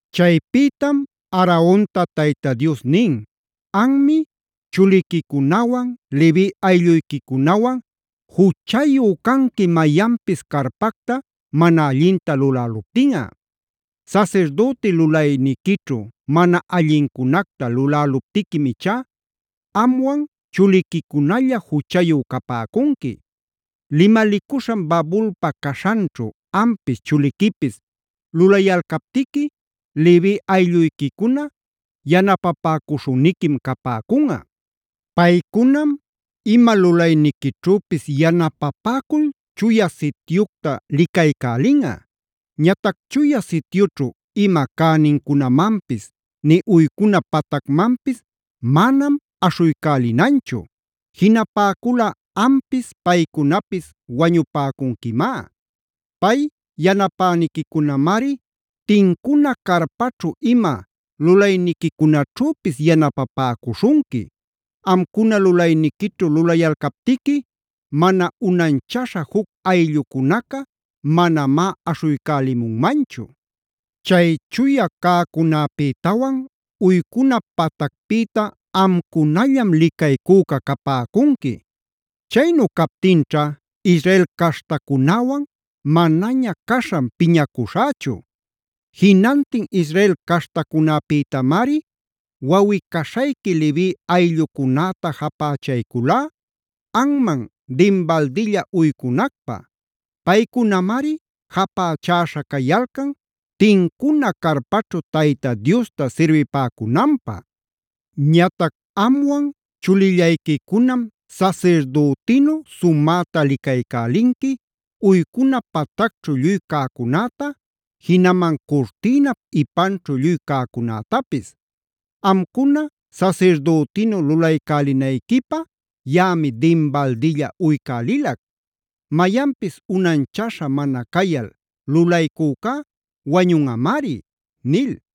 Chaypïtam Aaronta Tayta Dios nin: “Anmi, chuliquicunawan, Levi aylluyquicunawan juchayu canqui mayanpis carpacta mana allinta luläluptinꞌa. Sasirdüti lulayniquićhu mana allincunacta luläluptiquim ichá amwan chuliquicunalla juchayu capäcunqui. Limalicuśhan babulpa caśhanćhu ampis chuliquipis lulayalcaptiqui Levi aylluyquicuna yanapapäcuśhüniquim capäcunꞌa. Paycunam ima lulayniquićhüpis yanapapäcul Chuya Sityucta licaycälinꞌa. Ñatac Chuya Sityućhu ima cänincunamanpis, nï uycuna patacmanpis manam aśhuycälinanchu. Jinapäculꞌa ampis, paycunapis wañupäcunquimá. Pay yanapäniquicunamari tincuna carpaćhu ima lulayniquicunaćhüpis yanapapäcuśhunqui. Amcuna lulayniquićhu lulayalcaptiqui mana unanchaśha juc ayllucunaca manamá aśhuycälimunmanchu. Chay chuya cäcunäpïtawan uycuna patacpïta amcunallam licaycüca capäcunqui. Chaynu captinćha Israel caśhtacunäwan manaña caśhan piñacuśhächu. Jinantin Israel caśhtacunäpïtamari wawꞌi-caśhayqui Levi ayllucunäta japächayculá, anman dinbaldilla uycunacpä. Paycunamari japächäśha cayalcan tincuna carpaćhu Tayta Diosta sirbipäcunanpä. Ñatac amwan chulillayquicunam sasirdütinu sumäta licaycälinqui, uycuna patacćhu lluy cäcunäta, jinaman curtïnap ipanćhu lluy cäcunätapis. Amcuna sasirdütinu lulaycälinayquipä yaꞌami dinbaldilla uycälilac. Mayanpis unanchaśha mana cayal lulaycücá wañunꞌamari” nil.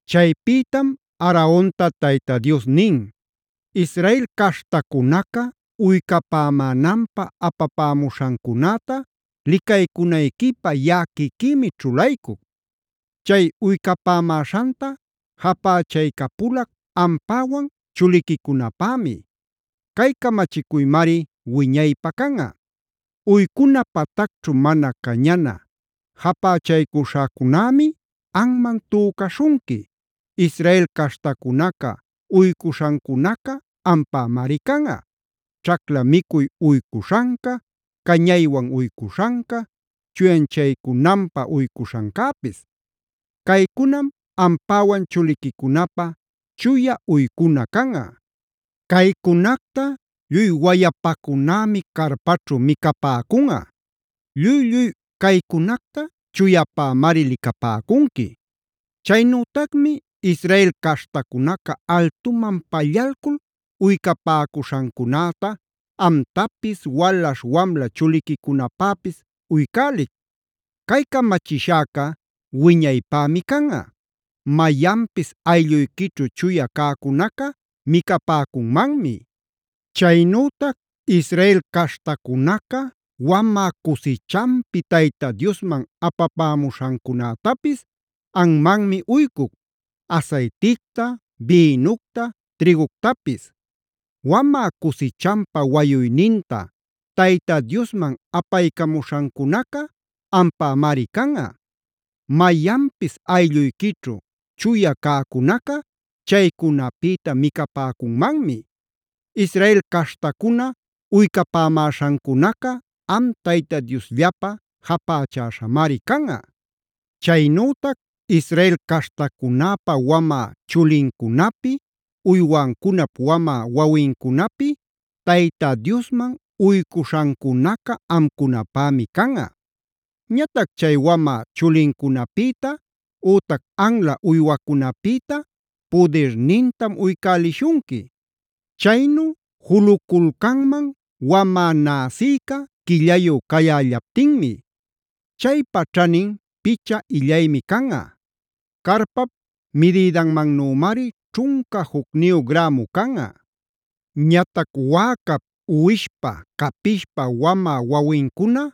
Chaypïtam Aaronta Tayta Dios nin: “Israel caśhtacunaca uycapämänanpä apapämuśhancunäta licaycunayquipä yaꞌa quiquïmi ćhulaycuc. Chay uycapämäśhanta japächaycapulac ampäwan chuliquicunapämi. Cay camachicuymari wiñaypä canꞌa. Uycuna patacćhu mana cañana japächaycuśhacunämi anman tücaśhunqui. Israel caśhtacunaca uycuśhancunaca ampämari canꞌa: ćhacla micuy uycuśhanca, cañaywan uycuśhanca, chuyanchaycunanpä uycuśhancäpis. Caycunam ampäwan chuliquicunapä chuya uycuna canꞌa. Caycunacta lluy wayapacunämi carpaćhu micapäcunꞌa. Lluy-lluy caycunacta chuyapämari licapäcunqui. “Chaynütacmi Israel caśhtacunaca altuman pallalcul uycapäcuśhancunäta amtapis, walaśh wamla chuliquicunapäpis uycälic. Cay camachishäca wiñaypämi canꞌa. Mayanpis aylluyquićhu chuya cäcunaca micapäcunmanmi. Chaynütac Israel caśhtacunaca wamä cusichanpi Tayta Diosman apapämuśhancunätapis anmanmi uycuc: asayticta, bïnucta, trïguctapis. Wamä cusichanpä wayuyninta Tayta Diosman apaycamuśhancunaca ampämari canꞌa. Mayanpis aylluyquićhu chuya cäcunaca chaycunapïta micapäcunmanmi. Israel caśhtacuna uycapämäśhancunacaa am Tayta Diosllapä japächäśhamari canꞌa. “Chaynütac Israel caśhtacunäpa wamä chulincunapi, uywancunap wamä wawincunapi Tayta Diosman uycuśhancunaca amcunapämi canꞌa. Ñatac chay wamä chulincunapïta ütac anla uywacunäpïta pudirnintam uycälishunqui. Chaynu juluculcanman wamä näsïca quillayü cayällaptinmi. Chaypa ćhanin picha illaymi canꞌa; carpap midïdanmannümari ćhunca jucniyu grämu canꞌa. Ñatac wäcap, uwishpa, capishpa wamä wawincuna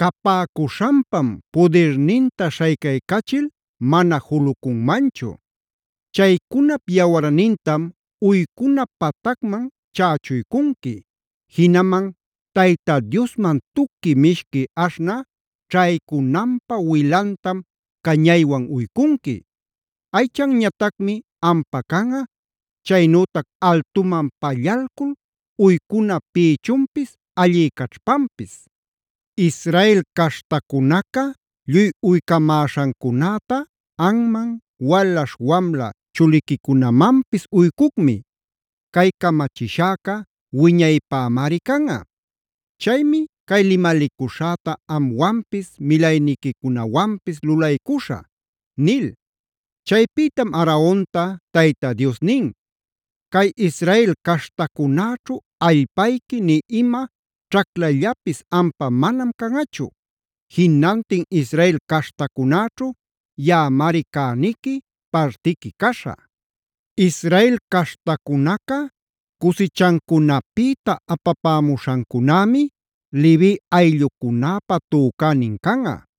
capäcuśhanpam pudirninta śhaycaycachil mana julucunmanchu. Chaycunap yawarnintam uycuna patacman chächuycunqui; jinaman Tayta Diosman tuqui mishqui aśhnä ćhaycunanpä wilantam cañaywan uycunqui. Aychanñatacmi ampa canꞌa, chaynütac altuman pallalcul uycuna pïchunpis allï caćhpanpis. Israel caśhtacunaca lluy uycamäśhancunäta anman, walaśh wamla chuliquicunamanpis uycucmi. Cay camachishäca wiñaypämari canꞌa. Chaymi cay limalicuśhäta amwanpis, milayniquicunawanpis lulaycuśhä” nil. Chaypïtam Aaronta Tayta Dios nin: “Cay Israel caśhtacunäćhu allpayqui nï ima ćhaclallapis ampa manam canꞌachu. Jinantin Israel caśhtacunäćhu yaꞌamari cäniqui, partiqui caśhä. Israel caśhtacunaca cusichancunapïta apapämuśhancunämi Levi ayllucunäpä tücänin canꞌa.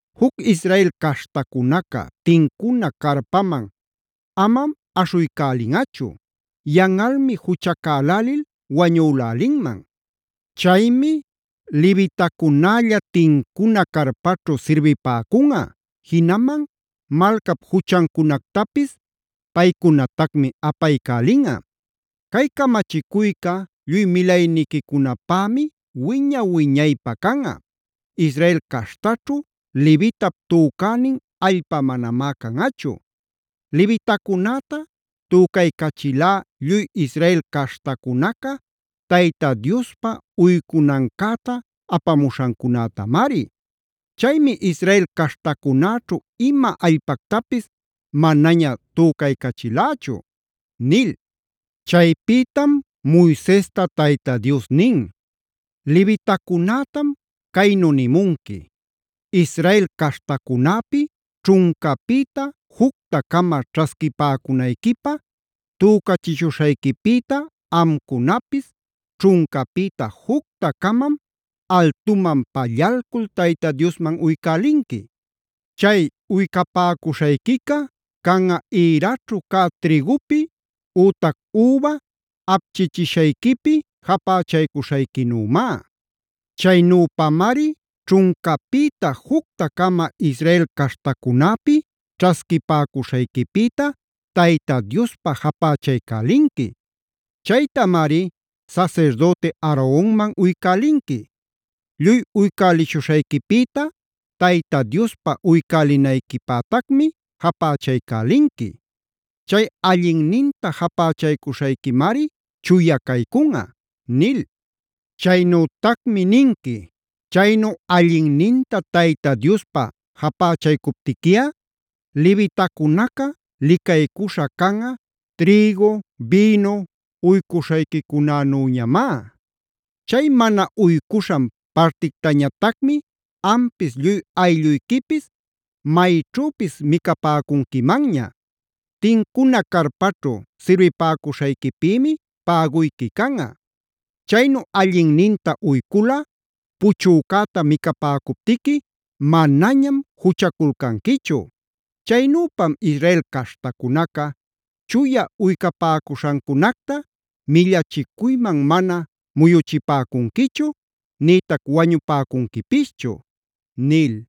Juc Israel caśhtacunaca tincuna carpaman amam aśhuycälinꞌachu; yanꞌalmi juchacälälil wañülälinman. Chaymi levitacunälla tincuna carpaćhu sirbipäcunꞌa, jinaman malcap juchancunactapis paycunatacmi apaycälinꞌa. Cay camachicuyca lluy milayniquicunapämi wiña-wiñaypä canꞌa: Israel caśhtaćhu levitap tücänin allpa manamá canꞌachu. Levitacunäta tücaycachilá lluy Israel caśhtacunaca Tayta Diospä uycunancäta apamuśhancunätamari. Chaymi Israel caśhtacunäćhu ima allpactapis manaña tücaycachilächu” nil. Chaypïtam Moisesta Tayta Dios nin: “Levitacunätam caynu nimunqui: ‘Israel caśhtacunäpi ćhuncapïta jucta-cama ćhasquipäcunayquipä tücachishuśhayquipïta amcunapis ćhuncapïta jucta-camam altuman pallalcul Tayta Diosman uycälinqui. Chay uycapäcuśhayquica canꞌa ïraćhu cä trïgupi ütac üba apchichishayquipi japächaycuśhayquinümá. Chaynüpamari ćhuncapïta jucta-cama Israel caśhtacunäpi ćhasquipäcuśhayquipïta Tayta Diospä japächaycälinqui. Chaytamari sasirdüti Aaronman uycälinqui. Lluy uycälishuśhayquipïta Tayta Diospa uycälinayquipätacmi japächaycälinqui. Chay allinninta japächaycuśhayquimari chuya caycunꞌa’ nil. “Chaynütacmi ninqui: ‘Chaynu allinninta Tayta Diospä japächaycuptiquiꞌa, levitacunaca licaycuśha canꞌa, trïgu, bïnu uycuśhayquicunänüñamá. Chay mana uycuśhan partictañatacmi ampis lluy aylluyquipis mayćhüpis micapäcunquimanña. Tincuna carpaćhu sirbipäcuśhayquipïmi päguyqui canꞌa. Chaynu allinninta uyculꞌa puchücäta micapäcuptiqui manañam juchaculcanquichu. Chaynüpam Israel caśhtacunaca chuya uycapäcuśhancunacta millachicuyman mana muyuchipäcunquichu, nïtac wañupäcunquipischu’” nil.